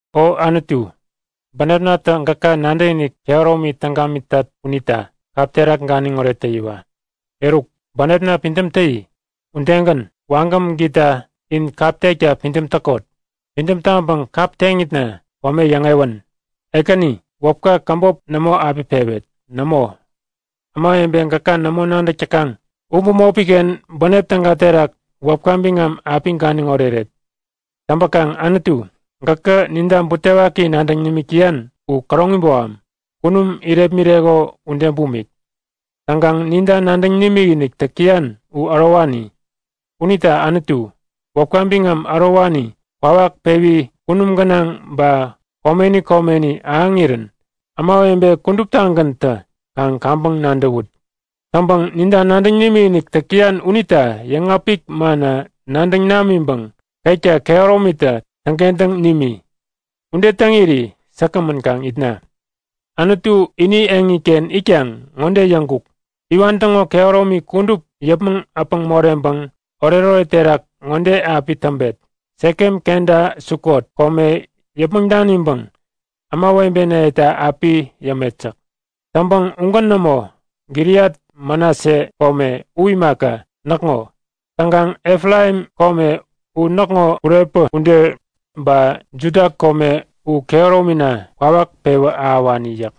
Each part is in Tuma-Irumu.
O Anutu, bänepnatä gäka nadäkinik kehäromi täŋ gamitat unita kap terak ganiŋoret täyiwa! Eruk, bänepna pidäm täyi! Udegän, wagäm gita in kap tekta pidäm täkot! Pidäm taŋpäŋ kap teŋitna kome yäŋewän! Ekäni, wäpka käbop nämo api pewet! Nämo, ämawebe gäka nämo nadäk täkaŋ u bämopiken bänep täga terak wäpka biŋam api ganiŋ oreret. Täŋpäkaŋ Anutu, gäkä ninta butewaki nadäŋ nimik täyan u käroŋi boham, kunum irepmireko ude bumik. Täŋkaŋ ninta nadäŋ nimikinik täk täyan u ärowani. Unita Anutu, wäpka biŋam ärowani kwawak pewi kunum gänaŋ ba komeni komeni ahäŋirän ämawebe kuduptagäntä kaŋ kaŋpäŋ nadäwut! Täŋpäŋ ninta nadäŋ nimikinik täk täyan unita yäŋapik manna nadäŋ namiŋpäŋ ketka kehäromitä täŋkentäŋ nimi. Ude täŋiri säkgämän kaŋ itna. Anutu ini eŋiken itkaŋ ŋode yäŋkuk; Iwan täŋo kehäromi kudup yäpmäŋ äpäŋ moreŋpäŋ oretoret terak ŋode api täŋpet; Sekem kenta Sukot kome yäpmäŋ daniŋpäŋ ämawebenayeta api yämet yäk. Täŋpäŋ ugän nämo. Gileat Manase kome u imaka, näkŋo. Täŋkaŋ Efraim kome u näkŋo kurepä ude, ba Juda kome u kehäromina kwawak pewä ahäwani yäk.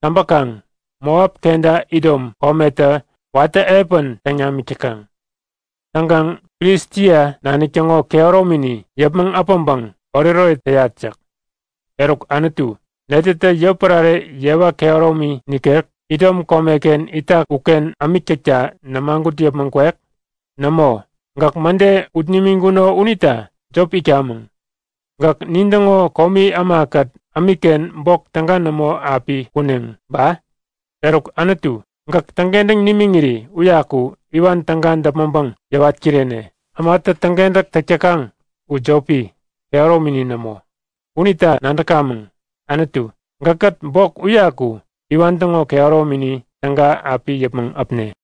Täŋpäkaŋ Moap kenta Idom kometä watä epän täŋ namik täkaŋ. Täŋkaŋ Filistia nanik täŋo kehäromini yäpmäŋ äpäŋpäŋ oretoret täyat yäk. Eruk Anutu, netätä yotpärare yewa kehäromi nikek, Idom komeken itak uken ämik täkta nämagut yäpmäŋ kwek? Nämo! Gäk mäde ut nimiŋkuno unita jop itkamäŋ. Gäk nintäŋo komi ämakät ämikken bok täga nämo api kuneŋ ba? Eruk Anutu, gäk täŋkentäŋ nimiŋiri uyaku iwan täga däpmäŋpäŋ yäwat kirene. Ämatä täŋkentäk täk täkaŋ u jopi, kehäromini nämo. Unita nadäkamäŋ! Anutu, gäkkät bok uyaku iwan täŋo kehäromini täga api yäpmäŋ äpne!